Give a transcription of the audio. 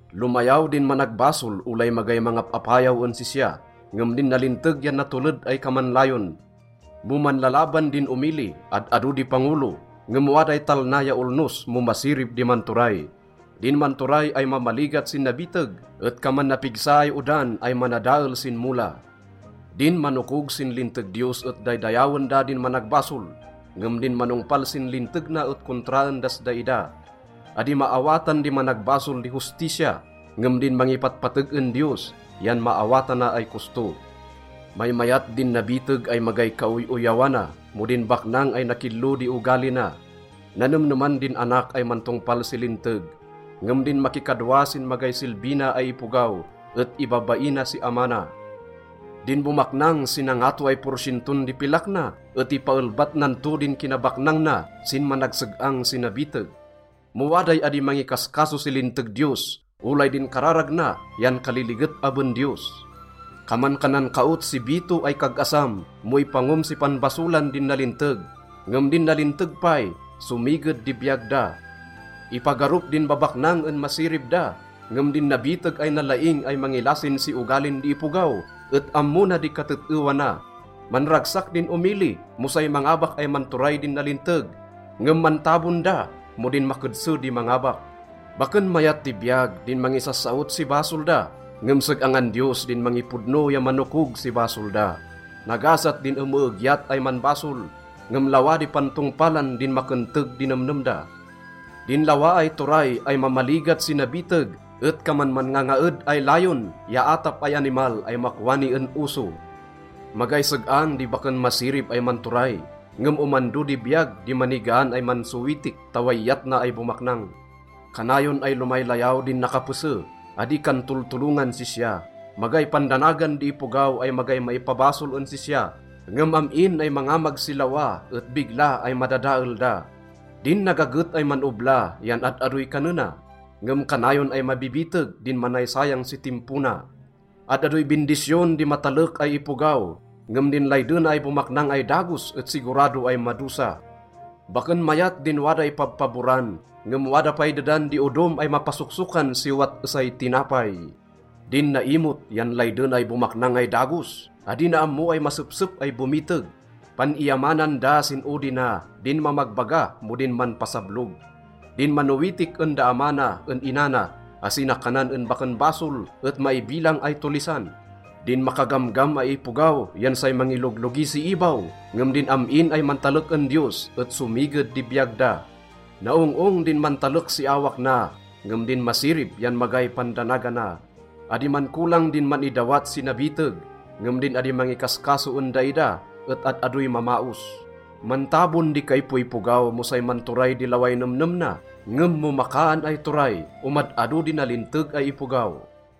Lomayaw din managbasol olay magay mangap-apayaw en sisya, ngem din nalinteg yan natoled ay kaman layon. Mo manlalaban din omili, ad-ado di pangolo, ngem waday talna ya olnos mo masirib di manturay. Din manturay ay mamaligat sin nabiteg et kaman napigsa ay odan ay manadael sin mola. Din manokog sin linteg Diyos et daydayawen da din managbasol, ngem din manongpal sin linteg na et kontraen das daida. Adi maawatan di managbasol di hustisya, ngem din mangipatpateg en Diyos yan maawatana ay kosto. Maymayat din nabiteg ay magay kaoy-oyawana mo din baknang ay nakillo di ogali na. Nanemneman din anak ay mantongpal si linteg, ngem din makikadwa sin magay silbi na ay ipogaw et ibabaina si ama na. Din bomaknang si nangato ay porsienton di pilak na et ipaelbat nan to din kinabaknang na sin managseg-ang si nabiteg. Mo waday adi mangikaskaso si linteg Diyos, olay din kararag na yan kaliliget aben Diyos. Kaman kan nankaot si bito ay kag-asam mo ipangom si panbasolan din nalinteg, ngem din nalinteg pay, somiged di biyag da. Ipagarup din babaknang en masirib da, ngem din nabiteg ay nalaing ay mangilasin si ogalin di ipogaw et ammo na di katet-ewa na. Manragsak din omili mo say mangabak ay manturay din nalinteg, ngem mantabon da mo din makedse di mangabak. Baken mayat di biyag din mangisassaot si basol da, ngem seg-angan Diyos din mangipodno ya manokog si basol da. Nagasat din emeegyat ay manbasol, ngem lawa di pantongpalan din makenteg di nemnem da. Din lawa ay turay ay mamaligat si nabiteg et kaman manngangaed ay layon ya atap ay animal ay makwani en oso. Magay seg-ang di baken masirib ay manturay, ngem omando di biyag di manigaan ay mansowitik ta way iyat na ay bomaknang. Kanayon ay lomaylayaw din nakapese, adi kan toltolongan sisya. Magay pandanagan di ipogaw ay magay maipabasol en sisya, ngem am-in ay mangamag si lawa et bigla ay madadael da. Din nagaget ay man-obla yan ad-adoy kanena, ngem kanayon ay mabibiteg din manaysayang si timpo na. Ad-adoy bindisyon di matalek ay ipogaw, ngem din laydena ay bomaknang ay dagos et sigurado ay madosa. Baken mayat din waday pabpaboran, ngem wada pay dedan di odom ay mapasoksokan si owat esay tinapay. Din naimot yan laydena ay bomaknang ay dagos. Adi na ammo ay masepsep ay bomiteg. Pan-iyamanan da sin odi na din mamagbaga mo din manpasablog. Din manowitik en da ama na en ina na asi na kanan en baken basol et maibilang ay tollisan. Din makagamgam ay ipogaw yan say mangiloglogi si ibaw, ngem din am-in ay mantalek en Diyos et somiged di biyag da. Naong-ong din mantalek si awak na, ngem din masirib yan magay pandanagana. Adi mankolang din man-idawat si nabiteg, ngem din adi mangikaskaso en daida et ad-adoy mamaos. Mantabon di kaipoipogaw mo say manturay di laway nemnem na. Ngem mo makaan ay turay, omad-ado di nalinteg ay ipogaw.